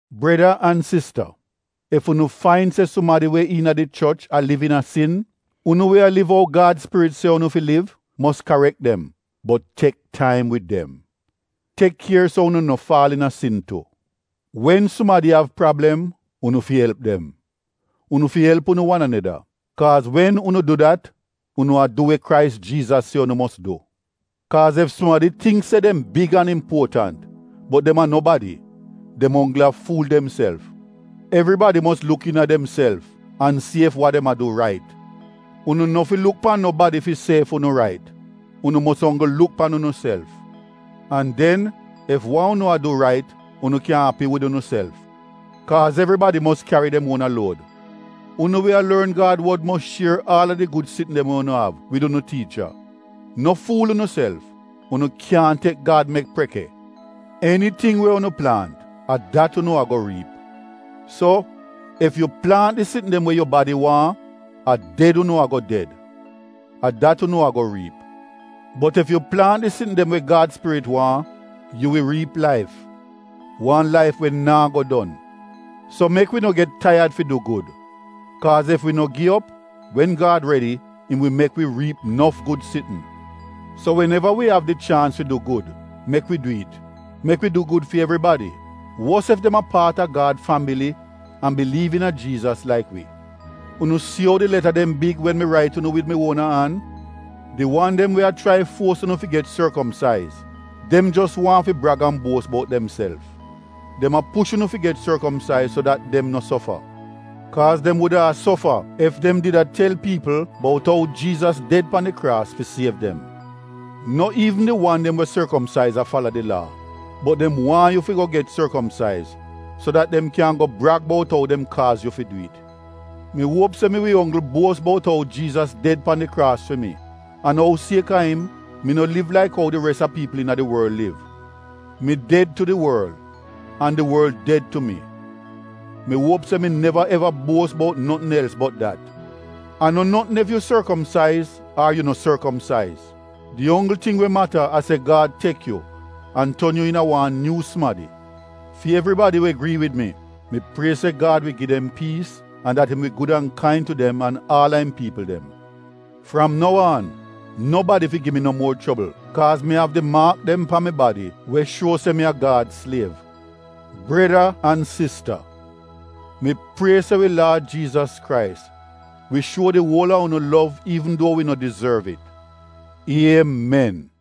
Breda an sista, ef unu fain se sumadi we iina di choch a liv iina sin, unu we a liv ou Gad Spirit se unu fi liv, mos karek dem bot tek taim wid dem. Tek kier so unu no faal iina sin tu. Wen sumadi av prablem, unu fi elp dem. Unu fi elp unu wan aneda. Kaaz wen unu du dat unu a du we Krais Jiizas se unu mos du. Kaaz ef sumadi tingk se dem big an impuotant bot dem a nobadi, dem onggl a fuul demself. Evribadi mos luk iina demself an si ef wa dem a du rait. Unu no fi luk pan nobadi fi si ef unu rait, unu mos onggl luk pan unuself. An den ef wa unu a du rait, unu kyan api wid unuself Kaaz evribadi mos kyari dem uona luod. Unu we a lorn Gad wod mos shier aal a di gud sitn dem we unu av wid unu tiicha. No fuul unuself: Unu kyaahn tek Gad mek preke. Eniting we unu plaant a dat unu a-go riip. So ef yu plaant di sitn dem we yu badi waahn, a ded unu a-go ded — a dat unu a-go riip. Bot ef yu plaant di sitn dem we Gad Spirit waahn yu wi riip laif, wan laif we naa go don. So mek wi no get taiyad fi du gud, kaaz ef wi no gi op, wen Gad redi, im wi mek wi riip nof gud sitn. So wen-eva wi av di chaans fi du gud, mek wi du it. Mek wi du gud fi evribadi, wos ef dem a paat a Gad fambili an biliiv iina Jiizas laik wi. Unu si ou di leta dem big wen mi rait unu wid mi uona an! Di wan dem we a chrai fuos unu fi get sorkomsaiz, dem jos waahn fi brag an buos bout demself. Dem a push unu fi get sorkomsaiz so dat dem no sofa. Kaaz dem wuda a sofa ef dem did a tel piipl bout ou Jiizas ded pan di kraas fi siev dem. No iivn di wan dem we sorkomsaiz a fala di Laa, bot dem waahn yu fi go get sorkomsaiz so dat dem kyan go brag bout ou dem kaaz yu fi du it. Mi uop se mi wi onggl buos bout ou Jiizas ded pan di kraas fi mi an ou siek-a im, mi no liv laik ou di res a piipl iina di worl liv — mi ded tu di worl an di worl ded tu mi. Mi uop se mi neva eva buos bout notn els bot dat. A no notn ef yu sorkomsaiz ar yu no sorkomsaiz; di onggl ting we mata a se Gad tek yu an ton yu iina wan nyuu sumadi. Fi evribadi we grii wid mi — mi prie se Gad wi gi dem piis an dat im wi gud an kain tu dem an aal a im piipl dem. Fram nou aan, nobadi fi gi mi no muor chobl kaaz mi av di maak dem pan mi badi we shuo se mi a Gad sliev. Breda an sista mi prie se wi Laad Jiizas Krais wi shuo di uol a unu lov iivn duo wi no dizorv it. Iemen!